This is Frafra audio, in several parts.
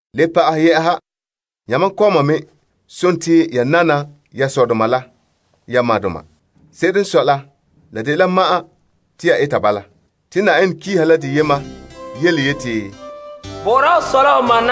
Le pa'ahɛ, yamam kɔma me, nana ya dɔgɔreba Yenɛ sore la poan. Se'ere n sɔe la, la dela ya tone te ya eta bala. Dena n de yia yele n tare nɔbiŋere, Na'aha ho sɔ la ho ma,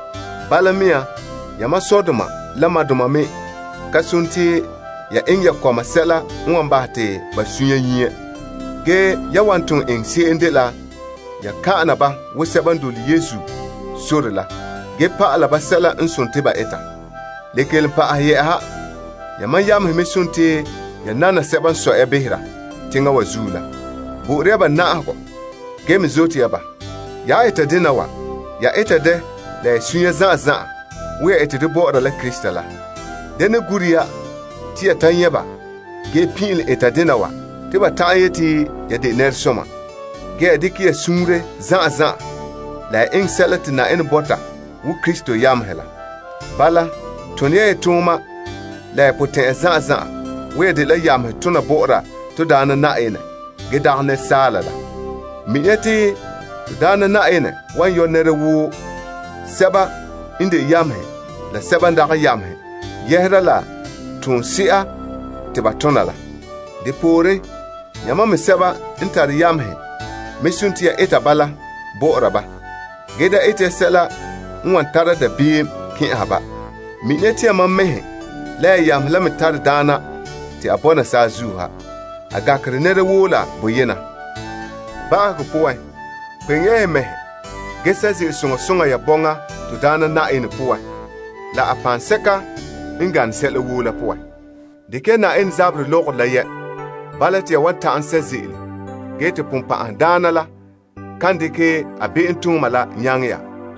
Bala mea, yamam sɔdoma la madoma me ka sontii ya eŋɛ ya kɔma sɛla n wan bahɛ te ba sunsunya nyie. Ge yan wan ton eŋɛ se'em dela ya kan'ana ba wo sɛba n dole Na'ayenɛ sore la ge pa'ala ba sɛla n nare ba eta. Le kelom pa'ahɛ yɛ'ɛha, yamam yamehe me nana sɛba n sɔe ya behera teŋa wa zuo la. Bo'ore ya ba na'ahegɔ ge me zote ya ba. Ya han eta dena wa, ya ete dɛ la ya sunya zan'an zan'an wo ya ete dɛ bɔ'ɔra la Krista la. Da ne gure ya te ya ta nyɛ' ba ge pin'ilom eta dena wa te ba ta'an yete ya de nɛresoma. Ge ya dekɛ ya suunre zan'an zan'an la ya eŋɛ sɛla te Na'ayenɛ bɔta wo Krista yamehe la. Bala, tone ya ya tooma la ya potɛn'ya zan'an zan'an wo ya dela yamehe tona bɔ'ɔra Na'ayenɛ gee dagɛ asaala la. Mina ya te Na'ayenɛ wan yɔ' nɛra woo sɛba n de yamehe la sɛba n dagɛ yamehe yɛhera la toon somse'a te ba tom la. Yamam me sɛba n tare yamehe me eta bala bɔ'ɔra ba ge da eta ya sɛla n wan tara dabeem kɛn'ɛha ba. Mina ya te yamam mɛhe la ya yamehe la me tare Daana te a bɔna saazuo ha. A gankere nɛra woo la boyena. Ba'ahegɔ poan, kpeŋe ya ya mɛhe ge sɛ' ze'ele soŋa soŋa ya bɔŋa Na'ayenɛ poan la a paŋsɛka n gane sɛla woo la poan. Dekɛ ya Yenɛ zaberɛ lɔgɔrɔ la yɛ'. Bala te ya wan ta'an sɛ' ze'ele ge te Sagona la kan dekɛ a be'emtooma la nyaŋɛ ya.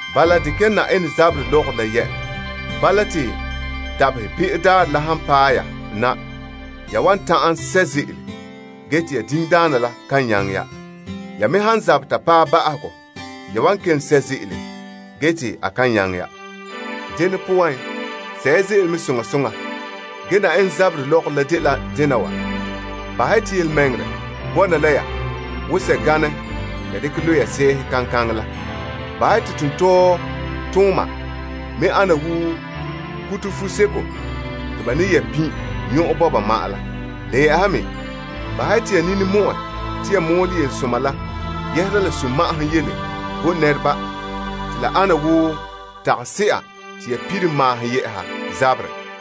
Bala, dekɛ ya Yenɛ zaberɛ lɔgɔrɔ la yɛ'. Bala, te dabaherɛ be'o daarɛ la han paɛ ya na, ya wan ta'an sɛ' ze'ele bala mea. Ya me han zabɛ ta paɛ ba'ahegɔ, ya wan kelom sɛ' ze'ele ge te a kan nyaŋɛ ya. Dene poan, sɛ' ya ze'ele mɛ soŋa soŋa. Gee Yenɛ zaberɛ lɔgɔrɔ la dela dena wa. Bahɛ ya te yelemɛŋɛrɛ bɔna la ya wo sɛganɛ te ya dekɛ lo' ya sɛɛhe kaŋkaŋɛ la. Bahɛ ya te tontɔɔtooma me ana wo kuto fuseko te ba ne yɛ' pin' nyɔn'ɔn bɔba ma'an la. Le yɛ'ɛha me, bahɛ ya te ya nini mɔ'ɛ la te ya mɔɔlɛ yelesoma la yɛhera sunma'ahom yele bo nɛreba te la ana wo tagase'a te ya pire maahom yeeha zaberɛ.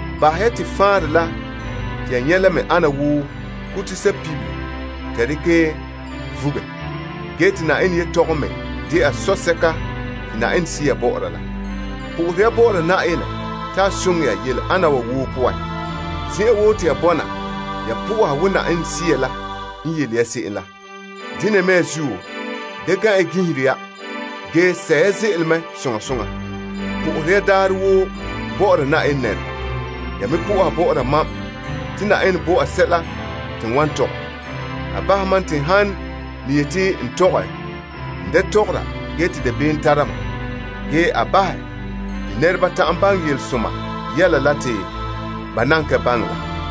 Bahɛ ya te faanrɛ la te ya nyɛ la me ana wo kuto sapibere te ya dekɛ vuge, ge te Yenɛ yelehom me dɛna soa te Yenɛ Sea bɔ'ɔra la. Po'ohere ya bɔ'ɔra Yenɛ te a soŋɛ ya yele ana wa woo poan. Zen'an woo te ya bɔna, ya soha wo Yenɛ Sea la n yele ya se'em la. Dena mea zuo, da gan' ya ginhera ge sɛ' ya ze'ele mɛ soŋa soŋa. Po'ohere ya daarɛ woo bɔ'ɔra Yenɛ nɛreba woo. Ya me po'oha bɔ'ɔra mam te Yenɛ bo te sɛla te n wan tɔgɛ. A bahɛ mam te n han ne yete n tɔgɛ, n tɔgɔra boraanɛ, ge bahɛ te nɛreba ta'an baŋɛ yelesoma yɛla la te ba nan ka baŋɛ la.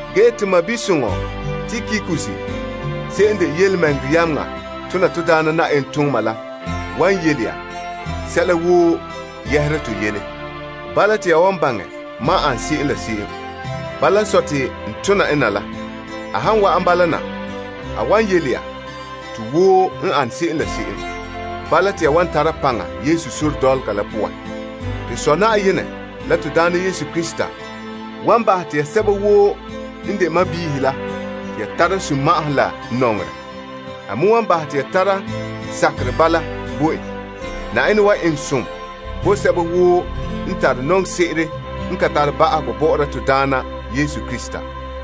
Ge to sɔɔn soŋɔ Tikikus se'em de birikina tona Na'ayenɛ tooma la wan yele ya sɛla woo yɛhera n yele. Bala, te ya wan baŋɛ mam ane se'em. Bala n sɔe, te n tona en na la. A han wa'an bala na, a wan yele ya to woo n ane se'em, ge kpemehe ya. To Sɔ Yenɛ la Na'ayenɛ Yesu Krista wan bahɛ te ya sɛba woo n de sɔɔnrɔ la te ya tara sunma'ahom la nɔŋerɛ. A me wan bahɛ te ya tara sakerɛ bala bo en. Yenɛ zo'ohogɔ bɔna la sɛba woo n tare nɔŋse'ere n ka tare ba'ahegɔ bɔ'ɔra to Na'ayenɛ Yesu Krista.